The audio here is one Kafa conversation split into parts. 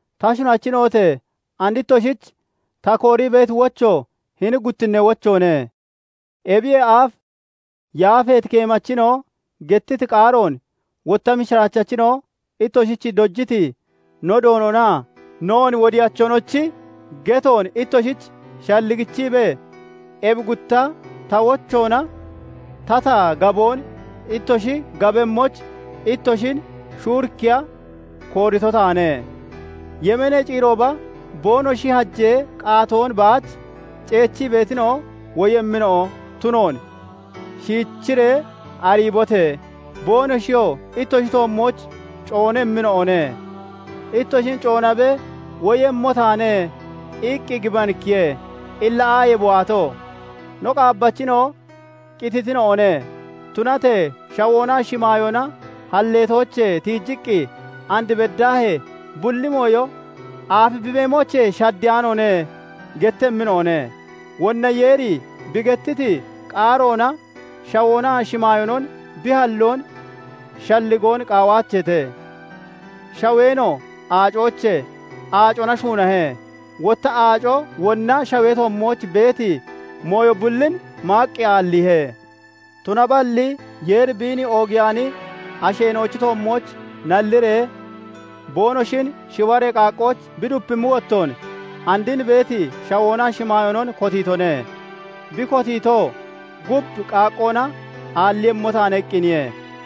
Ta shunachina'ote! And ittoshich ta koorii beeti wocho hini guttinnee wochoone. Ebiyee aaf yaafeeti keemachina'o gettiti qaaroon, wotta mishiraachachina'o ittoshich dojiti no Doononaa noon Wodiyachonochi getoon ittoshich shalligichiibee, ebi gutta ta wochoona tata gaboon ittoshi gabemmoyich ittoshin shuurikkiya koorito taane. Yemeenee ciirooba boonoshi hajee qaatoon baach ceechii beetina'o woyemmina'o tunoon shiichiree ariibote! Boonoshiyoo ittoshi toommooch coonemmina'one. Ittoshin coonabee, " 'Woyemmo taane' iqqi gibanikkiye; illa aaye bi waato? No qaabbachina'o qititina'one; tunatee shawoonaa shimaayoona halleetoochee tiijiqqi and beddaahee bulli mooyo aafi bi beemoochee shaddeyaanoone" gettemmina'one. Wonna Yeeri bi gettiti qaaroona shawoonaa shimaayoonon bi halloon shalligoon qaawaacheete; shaweenoo aacoochee aacona shuunahe; wotta aaco wonna shawee toommooch beeti mooyo bullin maaqqi aalliihe. Tunaballi Yeeri biin oogiyaani asheena'ochi toommooch nalliree boonoshin shiwaree qaaqqooch bi dupimmi wottoon, and hini beeti shawoonaa shimaayoonon kotiitone; bi kotiito, "Gub qaaqqoona aalliiyemmo taane" iqqiniye.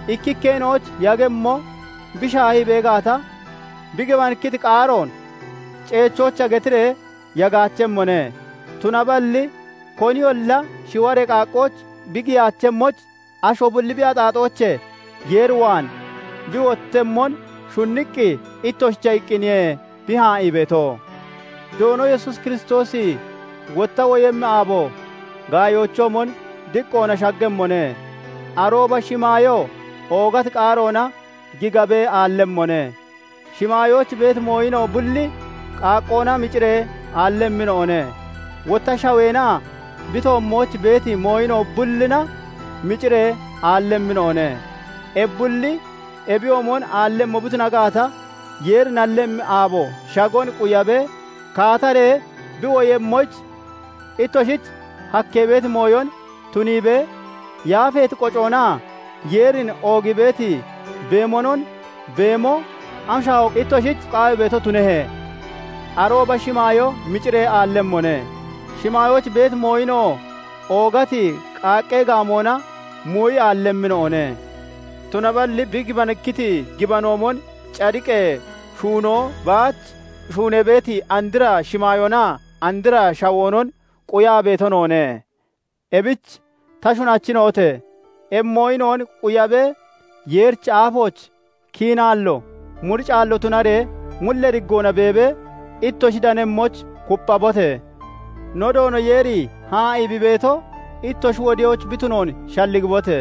Ikkikkeena'oyich yagemmo bi shaahii bee gaata, bi gibanikkiti qaaroon ceechoyicha getiree yagaachemmone; tunaballi koniyolla shiwaree qaaqqooch bi giyaachemmoyich, asho bulli bi axaaxoochee Yeer waan bi wottemmon shunniqqi, ittoshicha iqqiniye bi haa'ii beeto. Doono Yesuus Kiristoosi wotta woyemmi aabo gaayoochoomon diqqoona shaggemmone; arooba shimaayoo oogati qaaroona gigabee aallemmone; shimaayooch beeti mooyina'o bulli qaaqqoona miciree aallemmina'one; wotta shaweenaa bi toommooch beeti mooyina'o bullina miciree aallemmina'one. Ebi bulli ebiyoomon aallemmo bi tuna gaata, Yeeri nallemmi aabo shagon quyabee, kaataree bi woyemmoyich ittoshich hakkee beeti mooyon tuniibee, yaafeeti qocoonaa Yeerin oogii beeti beemonon beemo am shaahoon ittoshich qawii beeto tunehe? Arooba shimaayoo miciree aallemmone; shimaayooch beeti mooyina'oo oogati qaaqqee gaamoona muuyi aallemmina'one. Tunaballi bi gibanikkiti gibanoomon, cadiqee shuunoo baach shuunee beeti andra shimaayoonaa andra shawoonon quyaa beeto noone. Ebich ta shunachina'ote! Ebi mooyina'on quyabee, Yeerichi aafooch kiinaallo muricaallo tunaree mullee diggoona beebee ittoshi danemmoyich kupphabote! No Doono Yeeri haa'ii bi beeto ittoshi wodoyich bi tunoon shalligibote!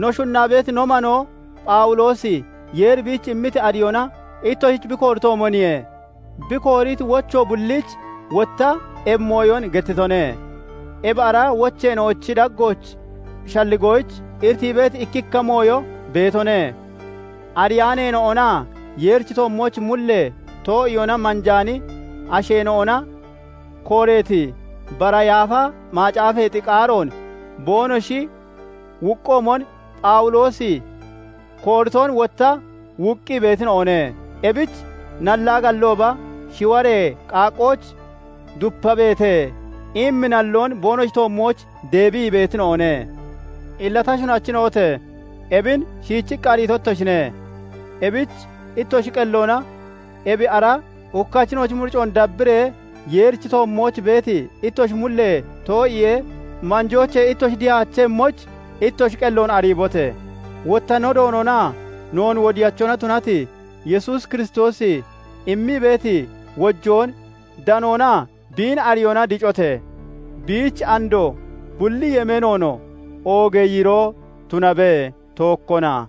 No shunnaa beeti no manoo Phawuloosi Yeeri biich immiti ariyoona ittoshich bi kooritoomoniye; bi kooriti wocho bulliich wotta ebi mooyon gettitone; ebi ara wocheena'ochi daggooch shalligoyich iritii beeti ikkikka mooyo beetone; ariyaaneena'onaa Yeerichi toommooch mullee too'iyoona manjaani asheena'ona kooreeti bara Yaafa Macaafeexi qaaroon boonoshi wuuqqoomon, Phawuloosi kooriton wotta wuuqqii beetina'one; ebich nallaa gallooba, "Shiwaree qaaqqooch dupabeete" immi nalloon boonoshi toommooch deebii beetina'one. Illa ta shunachina'ote! Ebin shiichiqqi ariito ittoshine; ebich ittoshi qelloona ebi ara hukkachina'ochi muricoon dabbiree Yeerichi toommooch beeti ittoshi mullee too'iyee manjoochee ittoshi dihaachemmoyich, ittoshi qelloon ariibote! Wotta no Doononaa noon Wodiyachona tunati Yesuus Kiristoosi immii beeti wojoon danoonaa biin ariyoona dicote! Biich andoo, bulli yemeenoonoo oogee yiiroo tunabe; tookkona.